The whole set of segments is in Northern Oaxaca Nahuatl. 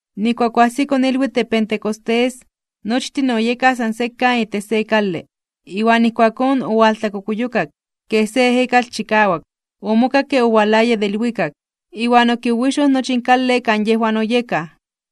Nijkuak oajsiko ilwitl de Pentecostés, nochtin oyekaj san sekan itech se kale. Iwan ijkuakón owaltlakokuyokak, kej se ejekatl chikawak, omokakke owalaya de ilwikak. Iwan okiwiwixoj nochi in kale kan yejwan oyekaj.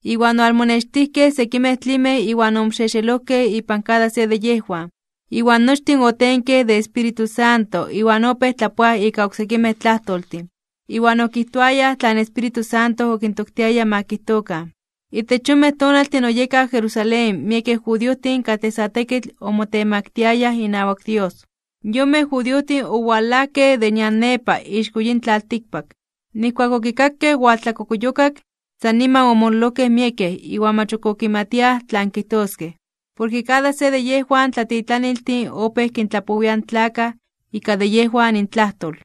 Iwan owalmonextijkej sekimej tlimej iwan omoxexelojkej ipan kada se de yejwan. Iwan nochtin otenkej de Espíritu Santo iwan opéj tlapoaj ika oksekimej tlajtoltin. Iwan okijtoayaj tlan Espíritu Santo okintoktiaya ma kijtokan. Itech yonmej tonaltin oyekaj Jerusalén miekej judiojtin katlej sa tekitl omotemaktiayaj inawak Dios. Yonmej judiojtin owalajkej de nian nepa ixko yin tlaltikpak. Nijkuak okikakej owaltlakokuyokak, san niman omololojkej miekej iwan mach ok okimatiaj tlan kijtoskej, porke kada se de yejwan tlatitlaniltin opéj kintlapowiaj in tlakaj ika de yejwan intlajtol.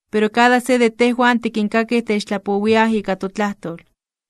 Pero kada se de tejwan tikinkakij techtlapowiaj ika totlajtol,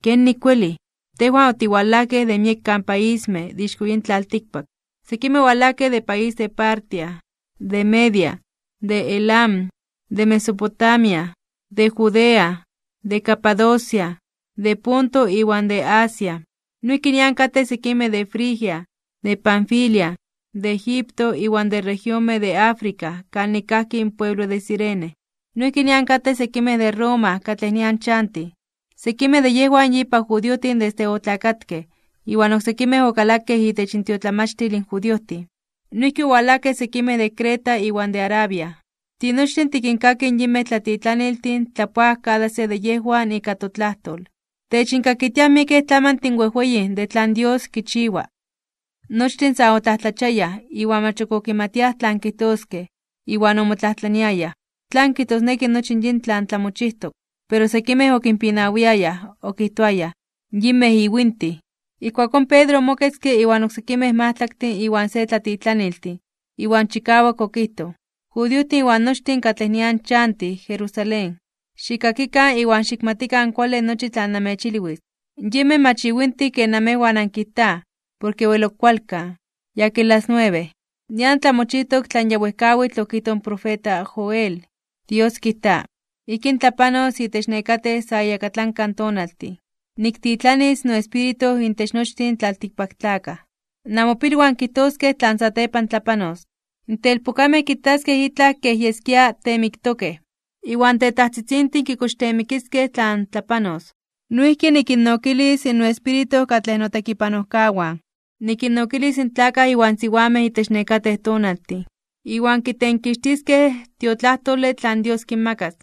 ¿kenik welij? Tejwan otiwalajkej de miekan paismej de ixko yin tlaltikpak. Sekimej owalajkej de país de Partia, de Media, de Elam, de Mesopotamia, de Judea, de Capadocia, de Ponto iwan de Asia, noijki nian katej sekimej de Frigia, de Panfilia, de Egipto iwan de regionmej de Africa kanik kajki in pueblo de Cirene. Noijki nian katej sekimej de Roma katlej nian chantij. Sekimej de yejwan yipa judiojtin desde otlakatkej, iwan oksekimej okalakej itech intiotlamachtil in judiojtin. Noijki owalajkej sekimej de Creta iwan de Arabia. Tinochtin tikinkakij in yinmej tlatitlaniltin tlapoaj kada se de yejwan ika totlajtol. Techinkakitiaj miekej tlamantin wejweyin de tlan Dios kichiwa. Nochtin sa otlajtlachiayaj (omomajmawtiayaj) iwan mach ok okimatiaj tlan kijtoskej, iwan omotlajtlaniayaj: ―¿Tlan kijtosneki nochi yin tlan tlamochijtok? Pero sekimej okinpinawiayaj, okijtoayaj: ―¡Yinmej iwintij! Ijkuakón Pedro omoketzke inwan oksekimej majtlaktin iwan se tlatitlaniltin, iwan chikawak okijtoj: ―Judiojtin iwan nochtin katlej nian chantij Jerusalén, xikkakikan iwan xikmatikan kuale nochi tlan namechilwis. Yinmej mach iwintij ken namejwan ankijtaj, porke wel ok kualkan, yakin las nuebe. Nian tlamochijtok tlan ya wejkawitl okijtoj in profeta Joel: Dios kijta: Ijkín tlapanos itech nekatej sa iyakatlanka tonaltin. Niktitlanis noEspíritu intech nochtin tlaltikpaktlakaj. Namopilwan kijtoskej tlan satepan tlapanos. In telpokamej kitaskej itlaj kej yeskia teemiktokej, iwan in tetajtzitzintin kikochteemikiskej tlan tlapanos. Noijki nikinnokilis noEspíritu katlej notekipanojkawan, nikinnokilis in tlakaj iwan siwamej itech nekatej tonaltin, iwan kitenkixtiskej in tiotlajtole tlan Dios kinmakas.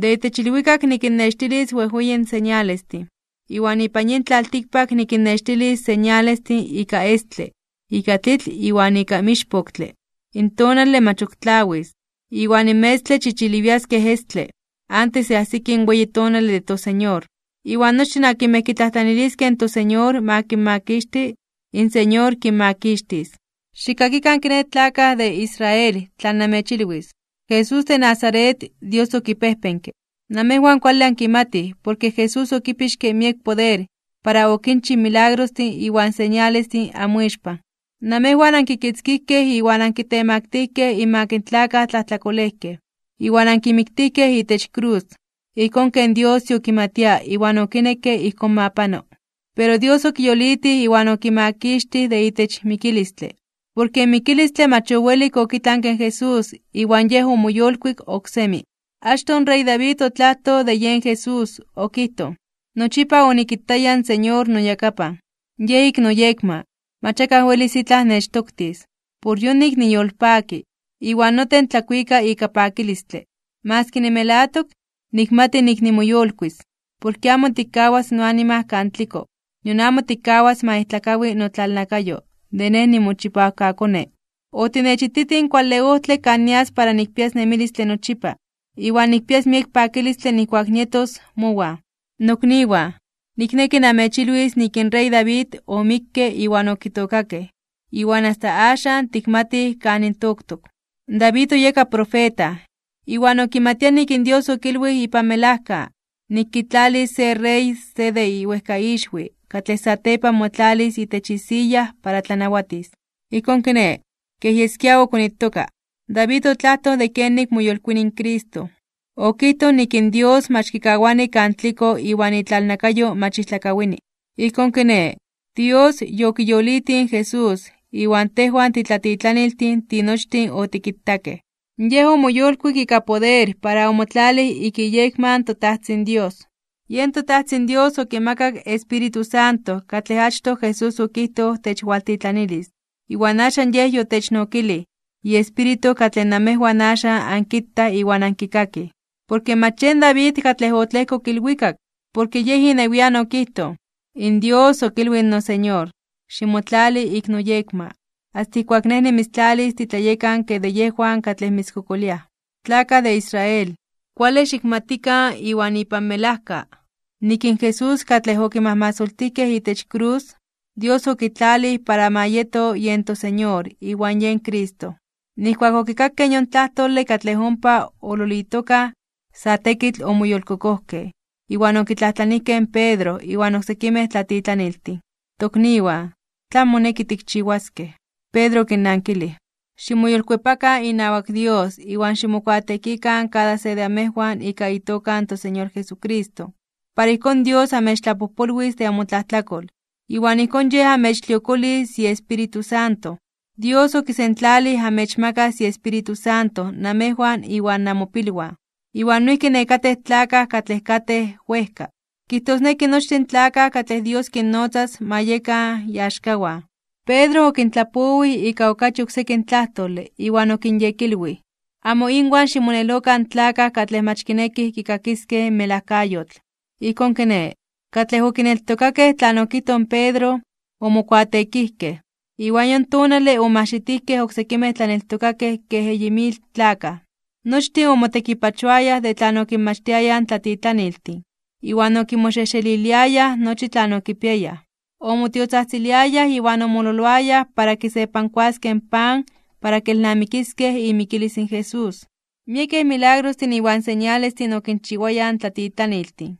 De itech ilwikak nikinnextilis wejweyin señalestin, iwan ipan yin tlaltikpak nikinnextilis señalestin ika estle, ika tlitl iwan ika mixpoktle. In tonale mach ok tlawis, iwan in metztle chichiliwias kej estle, antes de ajsiki in weyi tonale de toSeñor. Iwan nochtin akinmej kitlajtlaniliskej in toSeñor ma kinmakixti, in Señor kinmakixtis. ’Xikkakikan kiné tlakaj de Israel tlan namechilwis: Jesús de Nazaret, Dios okipejpenke. Namejwan kuale ankimatij porke Jesús okipixke miek poder para okinchij milagrostin iwan señalestin anmoixpan. Namejwan ankikitzkijkej iwan ankitemaktijkej (onkitemaktilijkej) inmak in tlakaj tlajtlakolejkej, iwan ankimiktijkej itech krus, ijkón ken Dios yokimatia iwan okinekke ijkón ma pano. Pero Dios okiyolitij iwan okimakixtij de itech mikilistle. Porke in mikilistle mach owelik okitlanke in Jesús iwan Yej omoyolkuik oksemi. Achtoj in rey David otlajtoj de yen Jesús, okijtoj: Nochipa onikitaya in Señor noyakapan. Yej ik noyekma, mach akaj welis itlaj nechtoktis. Por yonik niyolpaki, iwan noten tlakuika ika pakilistle. Maski nimelatok, nikmati nik nimoyolkuis (nimoyolitis). Porke amo tikkawas noanima kan tliko, nion amo tikkawas ma ijtlakawi notlalnakayo de Nej nimochipawkaKone. Otinechititij in kuale ojtle kan nias para nikpias nemilistle nochipa, iwan nikpias miek pakilistle nijkuak nietos mowan. ’Nokniwan, nikneki namechilwis nik in rey David omikke iwan okitookakej, iwan asta axan tikmatij kanin toktok. David oyeka profeta, iwan okimatia nik in Dios okilwij ipan melajka, nik kitlalis se Rey se de iwejkaixwi katlej satepan motlalis itech isiya para tlanawatis. Ijkón kiné, kej yeskia okonitoka, David otlajtoj de kenik moyolkuini in Cristo. Okijtoj nik in Dios mach kikawani kan tliko iwan itlalnakayo mach ijtlakawini. Ijkón kiné, Dios yokiyolitij in Jesús, iwan tejwan titlatitlaniltin tinochtin otikitakej. Yej omoyolkuik ika poder para omotlalij ik iyekma in toTajtzin Dios, yen toTajtzin Dios okimakak in Espíritu Santo katlej achtoj Jesús okijtoj techwaltitlanilis, iwan axan Yej yotechnokilij iEspíritu katlej namejwan axan ankitaj iwan ankikakij. Porke mach yen David katlej otlejkok ilwikak, porke yej inewian okijtoj: In Dios okilwij in noSeñor: “Ximotlali ik noyekma, asta ijkuak Nej nimitztlalis titlayekanke de yejwan katlej mitzkokoliaj.” ’Tlakaj de Israel, kuale xikmatikan iwan ipan melajka, nik in Jesús katlej ankimajmasoltijkej itech krus. Dios okitlalij para ma yeto yen toSeñor iwan yen Cristo. Nijkuak okikakej yon tlajtole katlej ompa oololitokaj, sa tekitl omoyolkokojkej, iwan okitlajtlanijkej in Pedro iwan oksekimej tlatitlaniltin: ―Tokniwan, ¿tlan moneki tikchiwaskej? Pedro okinnankilij: ―Ximoyolkuepakan inawak Dios iwan ximokuateekikan kada se de amejwan ika itoka in toSeñor Jesucristo, para ijkón Dios amechtlapojpolwis de amotlajtlakol, iwan ijkón Yej amechtliokolis iEspíritu Santo. Dios okisentlalij amechmakas iEspíritu Santo namejwan iwan namopilwan, iwan noijki nekatej tlakaj katlej katej wejka. Kijtosneki nochtin in tlakaj katlej Dios kinnotzas ma yekan iaxkawan. Pedro okintlapowij ika okachi oksekin tlajtole iwan okinyekilwij: ―¡Amo inwan ximonelokan in tlakaj katlej mach kinekij kikakiskej in melajkayotl! Ijkón kiné, katlej okineltokakej tlan okijtoj in Pedro, omokuateekijkej. Iwan yon tonale omajxitijkej oksekimej tlaneltokakej kej eyi mil tlakaj. Nochtin omotekipachoayaj de tlan okinmachtiayaj in tlatitlaniltin, iwan okimoxejxeliliayaj nochi tlan okipiayaj, omotiotzajtziliayaj iwan omololoayaj para kisepankuaskej in pan para kelnamikiskej imikilis in Jesús. Miekej milagrostin iwan señalestin okinchiwayaj in tlatitlaniltin.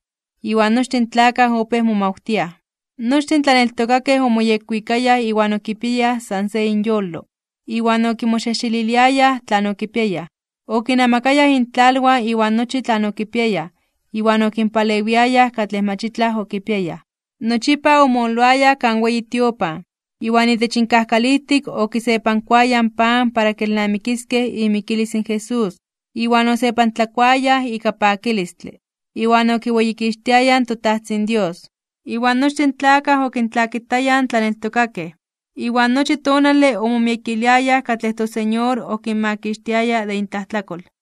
Iwan nochtin in tlakaj opéj momawtiaj. Nochtin in tlaneltokakej omoyekwikayaj iwan okipiayaj san se inyolo, iwan okimoxejxeliliayaj tlan okipiayaj. Okinnamakayaj intlalwan iwan nochi tlan okipiayaj iwan okinpalewiayaj katlej mach itlaj okipiayaj. Nochipa omololoayaj kan weyi tiopan, iwan itech inkajkalijtik okisepankuayaj in pan para kelnamikiskej imikilis in Jesús, iwan osepantlakuayaj ika pakilistle, iwan okiweyikixtiayaj in toTajtzin Dios. Iwan nochtin in tlakaj okintlakitayaj in tlaneltokakej, iwan nochi tonale omomiekiliayaj katlej toSeñor okinmakixtiayaj de intlajtlakol.